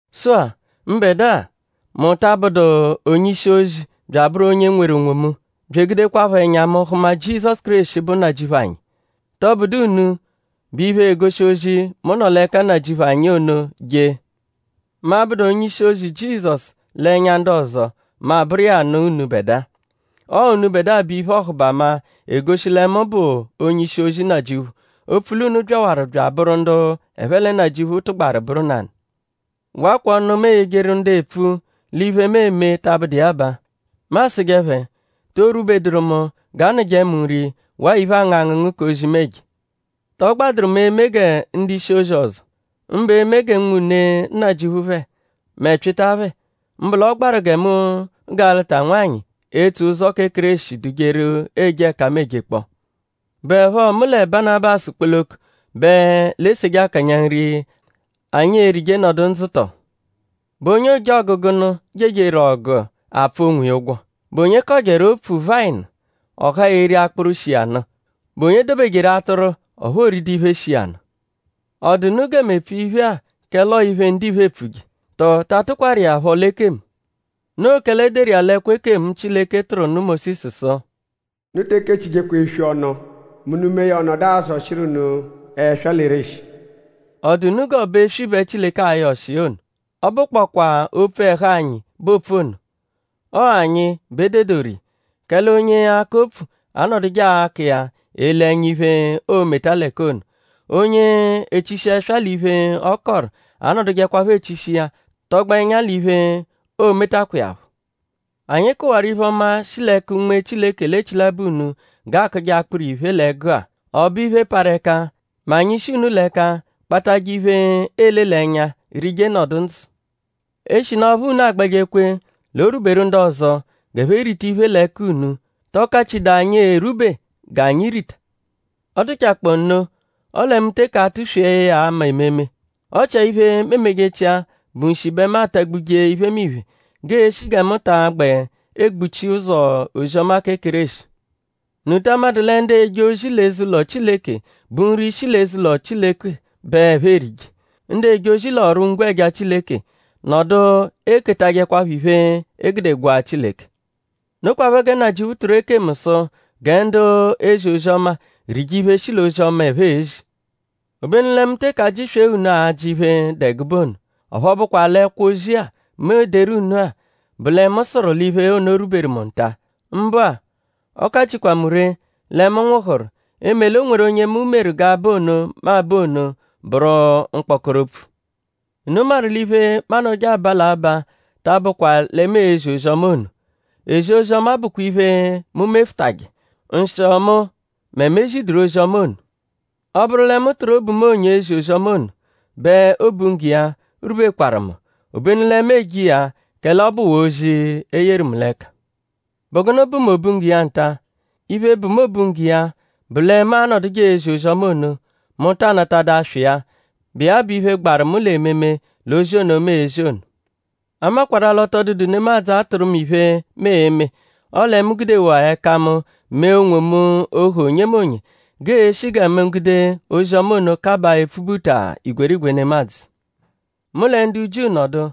Sụ-a mbẹdua;?mu ta abụdu onye-ishi-ozi bya abụru onye nweru onwomu; bya egudekwaphọ ẹnya mu hụma Jizọsu Kéreshi, bụ Nnajịuphu anyi??Tọbudu unu bụ iphe, egoshi ozi, mu nọ l'ẹka Nnajịuphu anyi ono jee? Mu 'abụdu onye-ishi-ozi Jizọsu l'ẹnya ndu ọzo; mu abụru iya nụ unubẹdua. Ọo unubẹdua bụ iphe-ọhubama, egoshi lẹ mu bụ onye-ishi-ozi Nnajịuphu; opfu l'unu byawaru bya abụru ndu ẹphe lẹ Nnajịuphu tụgbaru bụru nanụ. Wakwa ọnu, mu eyejeru ndu epfu l'iphe, mu eme ta abụdu iya baa: Mu asụje phẹ:?To rwubeduru mu g'aanụje mu nri waa iphe, aangụ angụngu k'ozi, mu eje? ?Tọ gbadụru mu eme gẹ ndu-ishi-ozi ọzo; mbụ eme g'unwune Nnajịuphu phẹ; mẹ Pyịta phẹ? Mbụ l'ọ gbaru gẹ mu ga lụta nwanyị, etso ụzo kẹ Kéreshi dujeru eje ẹka mu ejekpọ. ?Bụepho mu lẹ Banabasu kpoloko bẹ l'e-seje akanya nri, anyi e-rije nọdu ndzụ tọ? ?Bụ onye ojọgu gụnu jejeru ọgu apfụ onwiya ụgwo??Bụ onye kọjeru opfu vayịnu; ọ haa eri akpụru, shi iya nụ??Bụ onye dobejeru atụru ọphu o ridu iphe, shi iya nụ? ?Ọ dụ unu gẹ mu epfu iphe-a kẹle ọo iphe, ndiphe epfuje??Tọo ta atụkwaru iya phọ l'ekemu? Noo kẹle e deru iya l'ẹkwo ekemu, Chileke tụru nụ Mósisu sụ: “Unu te ekechijekwa eswi ọnu mẹ unu mee ya ọ nọdu azọshiru unu ẹswa l'ereshi.”?Ọ dụ unu g'ọ bụ eswi bẹ Chileke ayọ ọshi iya ono? Ọ bụkpokwaa opfu ẹhu anyi bẹ oopfu ono. Ọo anyi bẹ e dedoru iya. Kẹle onye akọ opfu anọduje akọ iya ele ẹnya iphe, o-meta l'ẹka ono. Onye echishi ẹswa l'iphe, ọ kọru anọdujekwapho echishi iya tọgbo ẹnya l'iphe, o-metakwa iya phọ. Anyi kụwaru iphe-ọma, shi l'ẹka Unme Chileke l'echilabọ unu g'aakụje akpụru-iphe l'ẹgu-a.?Ọ bụ iphe, parụ ẹka mẹ anyi -shi unu l'ẹka kpatajẹ iphe, eele l'ẹnya rije nọdu ndzụ? Eshinu ọphu unu agbẹje kwe l'o rwuberu ndu ọzo g'ẹphe rita iphe l'ẹka unu;?tọ kachidaa anyi erwube g'anyi rita? Ọ dụchakpoo nno; ọle mu teke atụ-swee ya ama ememe. Ọ chia iphe, mu emejechia bụ nshi bẹ mu atagbuje iphemiphe g'eeshi gẹ mu ta agbẹ egbuchi ụzo ozi-ọma kẹ Kéreshi. ?Unu ta amadụ lẹ ndu eje ozi l'eze-ụlo Chileke bụ nri shi l'eze-ụlo Chileke bẹ ẹphe erije? Ndu eje ozi l'ọru-ngwẹja Chileke nọdu eketajẹkwapho iphe, e gude gwaa Chileke. Nokwaphọ gẹ Nnajịuphu tụru ekemu sụ gẹ ndu ezi ozi-ọma rije iphe, shi l'ozi-ọma, ẹphe ezi. Obenu lẹ mu teke ajị-swee unu ajị iphe, dụ ẹgube ono. Ọphu ọ bụkwa l'ẹkwo-ozi-a, mu ederu unu-a bụ lẹ mu sụru l'iphe ono rwuberu mu nta. Mbụ-a; ọ kachikwa mu ree lẹ mu nwụhuru; eme l'o nweru onye meru g'aba ono, mu abaa ono, bụru mkpọkoro opfu. Unu maru l'iphe, mu anọduje aba l'abaa ta abụkwaa lẹ mu ezi ozi-ọma ono. Ezi ozi-ọma bụkwa iphe, mu mefụtaje. Nshịo mu mẹ mu ezidụru ozi-ọma ono! Ọ -bụru lẹ mu tụru obu mu onyo ezi ozi-ọma ono; bẹ obunggo iya rwubekwaru mu. Obenu lẹ mu eje iya kẹle ọ bụwaa ozi, e yeru mu l'ẹka. ?Bụ gụnu bụ mu obunggo iya nta? Iphe, bụ mu obunggo iya bụ lẹ mu anọduje ezi ozi-ọma ono; mu ta anatadụ aswa iya, bụ iya bụ iphe, gbaru mu l'ememe l'ozi ono, mu ezi ono. A makwarụ-a l'ọ tọ dụdu nemadzụ, atụ̀ru mu iphe, mu e-me; ọle mu gudewaa ẹka mu mee onwomu ohu onyemonye; g'eeshi gẹ mu gude ozi-ọma ono kabaa epfubuta igwerigwe nemadzụ. Mu lẹ ndu Jiu nọdu;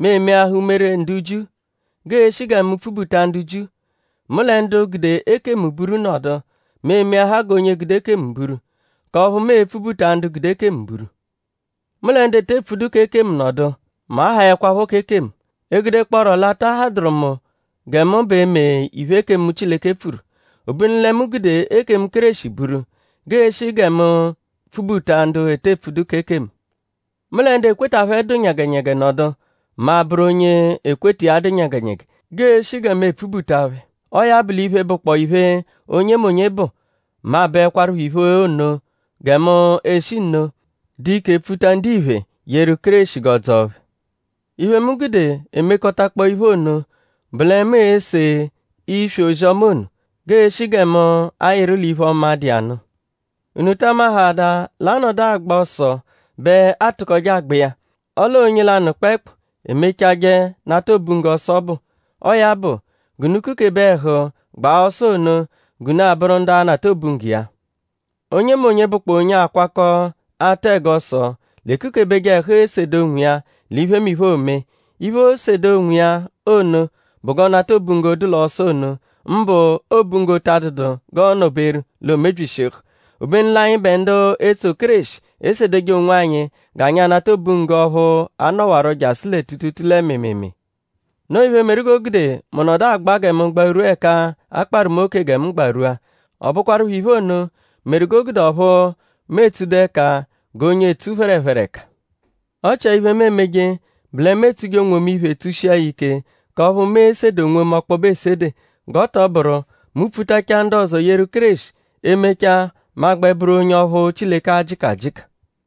mu emeahaa umere ndu Jiu; g'eeshi gẹ mu pfubuta ndu Jiu. Mu lẹ ndu gude ekemu buru nọdu; mu emeahaa g'onye gude ekemu buru; k'ọphu mu e-pfubuta ndu gude ekemu buru. Mu lẹ ndu ete pfudu k'ekemu nọdu; mu ahaẹkwapho k'ekemu; egudekpọoro l'a ta hadụru mu gẹ mu b'e mee iphe, ekemu Chileke pfuru; obenu lẹ mu gude ekemu Kéreshi buru; g'eeshi gẹ mu pfubuta ndu ete epfudu k'ekemu. Mu lẹ ndu ekweta phẹ dụ nyẹgenyege nọdu; mu abụru onye ekweta iya dụ nyẹgenyege g'eeshi gẹ mu epfubuta phẹ. Ọo ya bụ l'iphe, bụkpoo iphe, onyemonye bụ; mu abụekwarupho iphe ono gẹ mu eshi nno dụ ike pfuta ndiphe yeru Kéreshi g'ọ dzọo phẹ. Iphe, mu gude emekọtakpoo iphe ono bụ lẹ mu ese iswi ozi-ọma ono; g'eeshi gẹ mu ayịru l'iphe-ọma, dụ iya nụ. ?Unu ta amahaadaa l'a -nọdu agba ọso bẹ a tụkoje agba iya; ọle ọo onye lanụ kpẹekpu emechajẹ nata obunggo ọso ọbu? Ọo ya bụ; g'unu kukebe ẹhu gba ọso ono g'unu abụru ndu a-nata obunggo iya. Onyemonye, bụkpoo onye akwakọ atụ ẹgo ọso l'ekukebeje ẹhu esede onwiya l'iphemiphe, oome. Iphe, oosede onwiya ono bụ g'ọ nata obunggo, dụ l'ọso ono; mbụ obunggo ta adụdu g'ọo nọ-beru l'o mebyishihu. Obenu l'anyịbe ndu etso Kéreshi esedeje onwanyi g'anyi anata obunggo ọphu a-nọwaro jasụ lẹ tuutuutuu lẹ mịimiimii. Noo iphe, meru g'o gude mu nọdu agba gẹ mu gbarwua ẹka a kparụ mu oke gẹ mu gbarwua. Ọ bụkwarupho iphe ono meru g'o gude ọphu mu etsudu ẹka g'onye etsu phẹrephere ẹka. Ọ chia iphe, mu emeje bụ lẹ mu etsuje onwomu iphe; tsushia ya ike k'ọphu mu e-sede onwomu ọkpobe esede; g'ọ tọ bụru mu -pfutachaa ndu ọzo yeru Kéreshi; e -mechaa mu a-gbẹ bụru onye ọphu Chileke a-jịka ajịka.